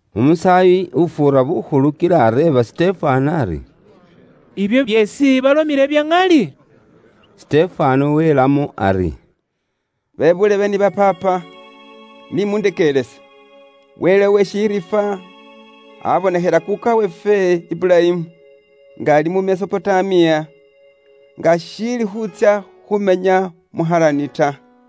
Umusaayi ufuura bukhulu kila areeba Sitefano ari, “Ibyo byeesi balomile bya ŋali?” Sitefano welamo ari: “Bebuulebe ni ba paapa, ni mundekeerese. Wele uwe shiriifwa aabonekhela kuuka weefwe Iburayimu, nga ali mu Mesopotamiya, nga ashiili khuutsya khumenya mu Harani ta.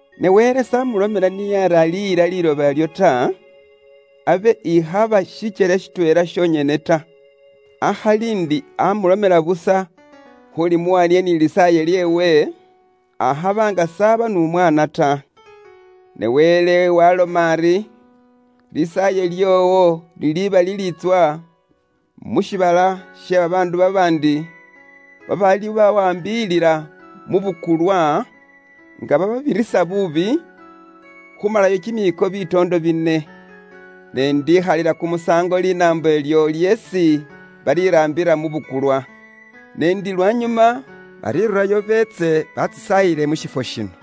Ne Wele s'amulomela niye ari aliyila liiloba ilyo ta, abe ikhaba shikyele shitweela shonyene ta, akhali ndi amulomela busa khulimuwa niye ni lisaaye lyeewe, akhaba nga saaba n'umwaana ta. Ne Wele waaloma ari, ‘Lisaaye lyoowo liliba liliitswa mu shiibala she babaandu babaandi, babaalibawaambilila mu bukulwa nga bababirisa buubi, khumala kimiiko bitoondo bine. Ne ise indikhalila kumusaango linaambo ilyo lyeesi baliraambila mu bukulwa. Ne ndi lwanyuma balirurayo beetse bantsisaayile mu shifwo shino.’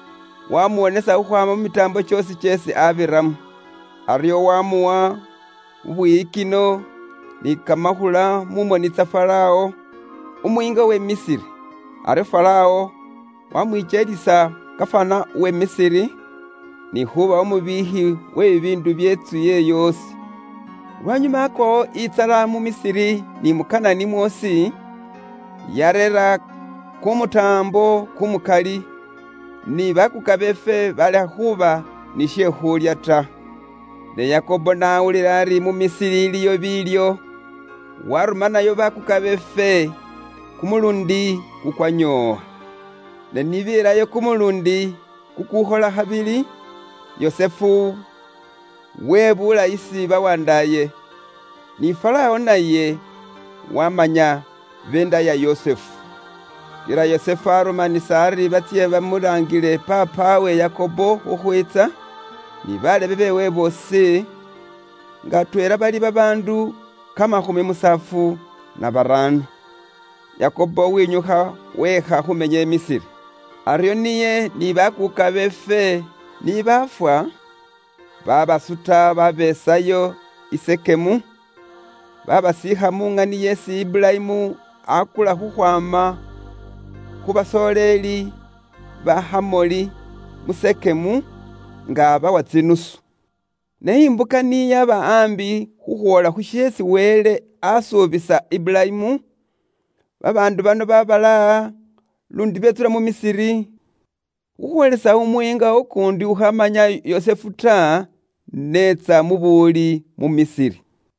Waamuwonesa khukhwaama mu mitaambo kyoosi kyeesi abiramo. Aryo waamuwa bubwiyikino ni kamakhula mu moni tsa Farawo, umuyiinga we Misiri. Aryo Farawo wamwikyelisa gafana uwe Misiri, ni khuuba umubiikhi we bibiindu bye ntsu yeewe yoosi. “Lwanyuma aakwawo intsala mu Misiri ni mu Kanani mwoosi, yaareera kumutaambo kumukali, ni bakuuka beefwe baalekha khuuba ni she khuulya ta. Ne Yakobo n'awulila ari mu Misiri iliyo biilyo, waarumanayo bakuuka beefwe kumuluundi kukwanyoowa. Ne ni beelayo kumuluundi kukuukhola khabili, Yusufu webuula isi babandaaye, ni Faraawo naye waamanya beenda ya Yusufu. Kila Yusufu arumanisa ari batsye bamulaangile paapawe Yakobo khukhwiitsa, ni balebe beewe boosi, nga atweela bali babaandu kamakhumi musaafu na baraano. Yakobo wenyukha weekha khuumenya i Misiri. Aryo niye ni bakuuka beefwe ni baafwa, baabasuta baabeesayo i Sekemu, baabasiikha mu ŋani isi Iburayimu aakula khukhwaama khu basooleli ba Hamoli mu Sekemu, nga abawa tsinusu. “Ne imbuka ni yaba aambi khukhwoola khu sheesi Wele asuubisa Iburayimu, babaandu bano babalaaha, luundi betsula mu Misiri, khukhwoolisa umuyiinga ukuundi ukhamanya Yusufu ta, n'etsa mu buwuli mu Misiri.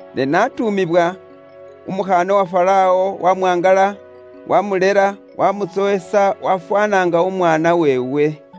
Ne n'atuumibwa, umukhaana wa Farawo wamwangala, wamulela, wamutsowesa wafwaana nga umwaana weewe.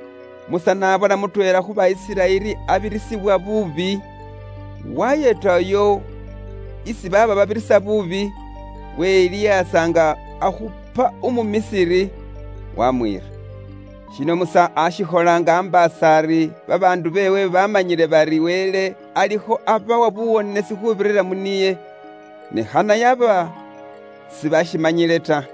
Musa n'abona mutweela khu ba Isiraeli abirisibwa buubi, wayeeta uyo isi baaba babirisa buubi, welihaasa nga akhupa umu Misiri, waamwiira. Shino Musa aashikhola nga ambaasa ari babandaayeewe baamanyile bari Wele alikho abawa nibo buwonesi khuubirira mu niye, ne khana yaba sibashimanyile ta.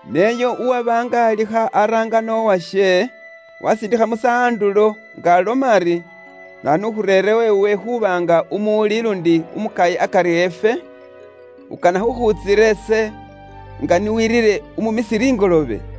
Ne uyo uwaba nga alikho abirisa buubi uwashe, waasiindikha Musa andulo nga aloma ari, ‘Naanu ukhureerewo iwe khuuba nga umuwuli luundi umukayi akari efwe? Ukana khukhuntsira ise nga ni weerire umu Misiri ingoloobe?’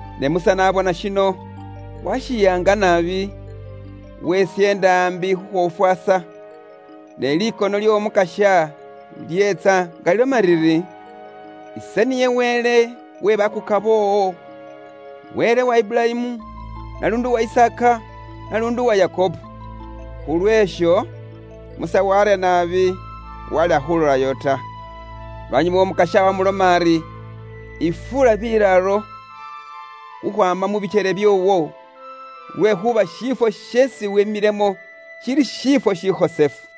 Ne Musa n'abona shino, washiyaanga naabi, wesyeenda ambi khushofwaasa, ne likono ly'Omukasya lyeetsa nga liloma liri, ‘Ise niye Wele we bakuuka boowo, Wele wa Iburayimu, naluundi uwa Isaaka, naluundi uwa Yakobo.’ Khulweesho, Musa warya naabi, walekha khulolayo ta. “Lwanyuma Umukasya waamuloma ari, ‘Yifuula bilaalo khukhwaama mu bikyele byoowo, lwekhuuba shiifwo sheesi wemilemo shili shiifwo shikhosefu.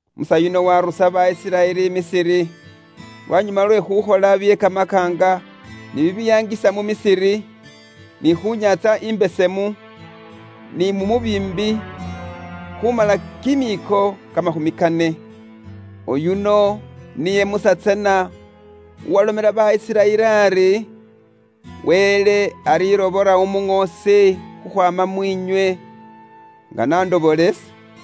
Musa yuno waarusa ba Isiraeli i Misiri, lwanyuma lwe khukhola bye kamakaanga ni bibiyaangisa mu Misiri, ni khu Nyaantsa Imbesemu, ni mu mubiimbi, khumala kimiiko kamakhumi kane. “Oyuno niye Musa tsana uwalomela ba Isiraeli ari, ‘Wele alirobola umuŋoosi khukhwaama mu bandaayeenywe, nga n'andobora ise.’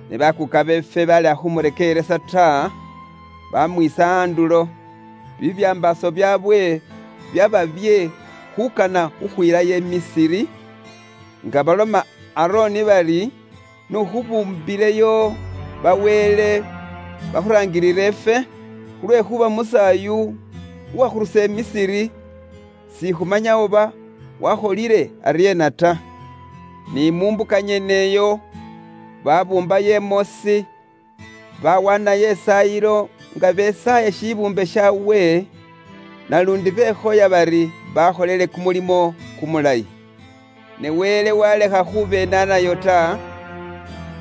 “Ne bakuuka beefwe baalekha khumurekeeresa niye ta, baamwiisa andulo, kimyoyo kyaabwe kyaaba nga kikana khukhwilayo i Misiri, nga baloma Aroni bari, ‘N'ukhubuumbileyo ba wele bakhuraangilile ifwe, lwekhuuba Musa uyu uwakhurusa ifwe mu liloba lye i Misiri, sikhumanya oba wakholile aryeena ta.’ Ni mu mbuka nyeneyo, babuumbayo imoosi, bawaanayo isaayilo nga besaaya shibuumbe shaawe, naluundi bekhoya bari bakholile kumulimo kumulayi. Ne Wele waalekha khubenaanayo ta,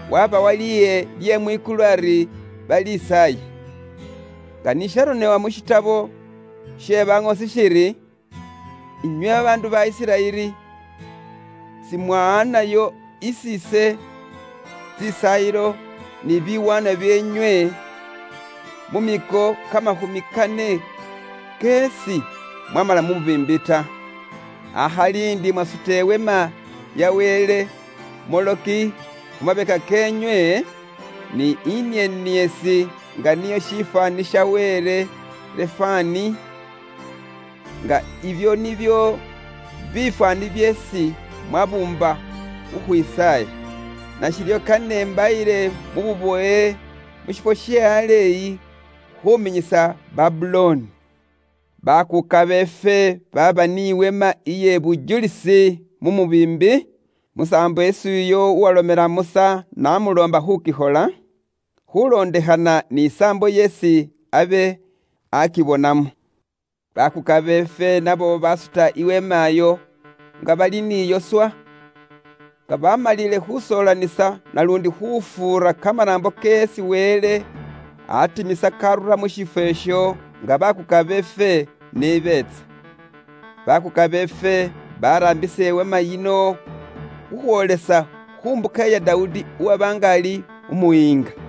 waabawa liye lye mwikulu ari balisaaye. Nga ni sharonebwa mu burone bwe baŋoosi shiri, ‘Inywe babaandu ba Isiraeli, simwawaanayo isi ise tsisaayilo ni biwaanwa byeenywe, mu miiko kamakhumi kane kyeesi mwamala mu mubiimbi ta. Akhali ndi mwasuta iweema ya wele Moloki khu mabeka keenywe, ni inieniesi nga niyo shifwaani sha wele Refani, nga ibyo nibyo bifwaani byeesi mwabuumba khukhwisaaya. Nashiryo kane imbayile mu bubowe mu shifwo she aleeyi khuminyisa Babulooni.’ “Bakuuka beefwe baaba ni weema iye bujulisi mu mubiimbi, musaambo isi uyo uwalomela Musa n'amuloomba khukikhola, khulondekhana ni saambo yeesi abe akibonamo. Bakuuka beefwe nabo basuta iweema iyo nga bali ni Yoswa, nga bamalile khusoolanisa naluundi khufuura kamanaambo keesi Wele atimisa karura mu shifwo isho nga bakuuka beefwe ni beetsa. Bakuuka beefwe baraambisa iweema yino khukhwoolesa khu mbuka ya Dawudi uwaba nga ali umuyiinga.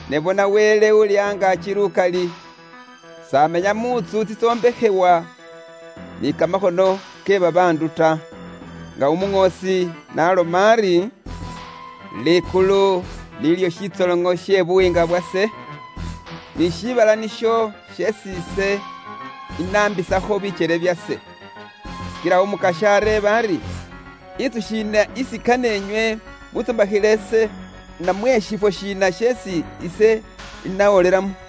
“Ne bona Wele Uuli Angaaki Lukali s'amenya mu ntsu tsitsombekhebwa ni kamakhono ke babaandu ta. Nga umuŋoosi n'aloma ari, ‘Likulu nilyo shitsoloŋo she buyiinga bwase, ni shiibala nisho sheesi ise inaambisakho bikyele byase.’ Kila Umukasya areeba ari, ‘Intsu shiina isi kane inywe muntsombakhile ise, namwe shifwo shiina sheesi ise inawolelamo?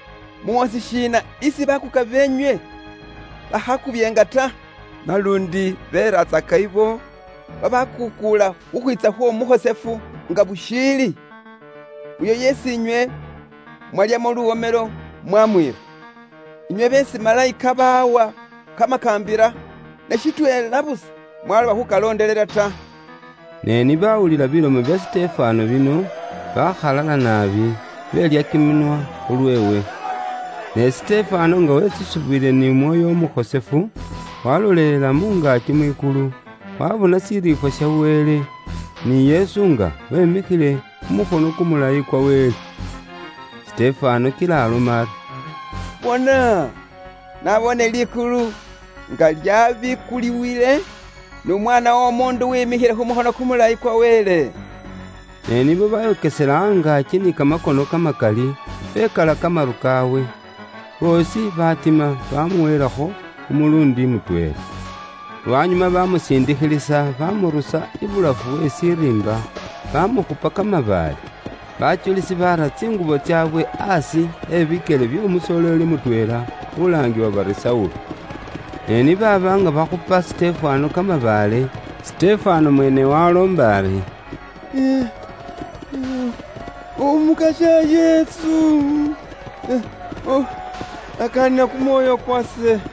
Muŋoosi shiina isi bakuuka beenywe bakhaakubyeenga ta? Naluundi beeratsaka abo babakuukuula khukhwiitsa khw'Omukhosefu nga bushiili, uyo yeesi inywe mwalyamo luwomelo mwamwiira. Inywe beesi malayika baawa kamakaambila, ne shitweela busa mwaloba khukalondelela ta.” Ne ni baawulila bilomo bya Sitefano bino, baakhalala naabi, beelya kiminwa khu lweewe. Ne Sitefano nga wetsusibwile n'Umwoyo Umukhosefu, walolelela mu ngaaki mwikulu, waabona shiriifwa sha Wele, ni Yesu nga wemikhile khu mukhono kumulayi kwa Wele. Sitefano kila aloma ari, “Bona, naboone likulu nga lyabikuliwile, n'Umwaana w'Omuundu wemikhile khu mukhono kumulayi kwa Wele.” Ne nibo bayokesela angaaki ni kamakono kamakali, bekala kamaru kaawe, boosi baatima baamuweelakho kumuluundi mutweela. Lwanyuma baamusiindikhilisa, baamurusa ibulafu we shiriimba, baamukhupa kamabaale. Bajulisi baara tsingubo tsaabwe aasi e bikyele by'omusoleeli mutweela, ulaangibwa bari Saulo. Ne ni baaba nga bakhupa Sitefano kamabaale, Sitefano mweene waaloomba ari, “Umukasya Yesu, yakaanila kumwoyo kwase.”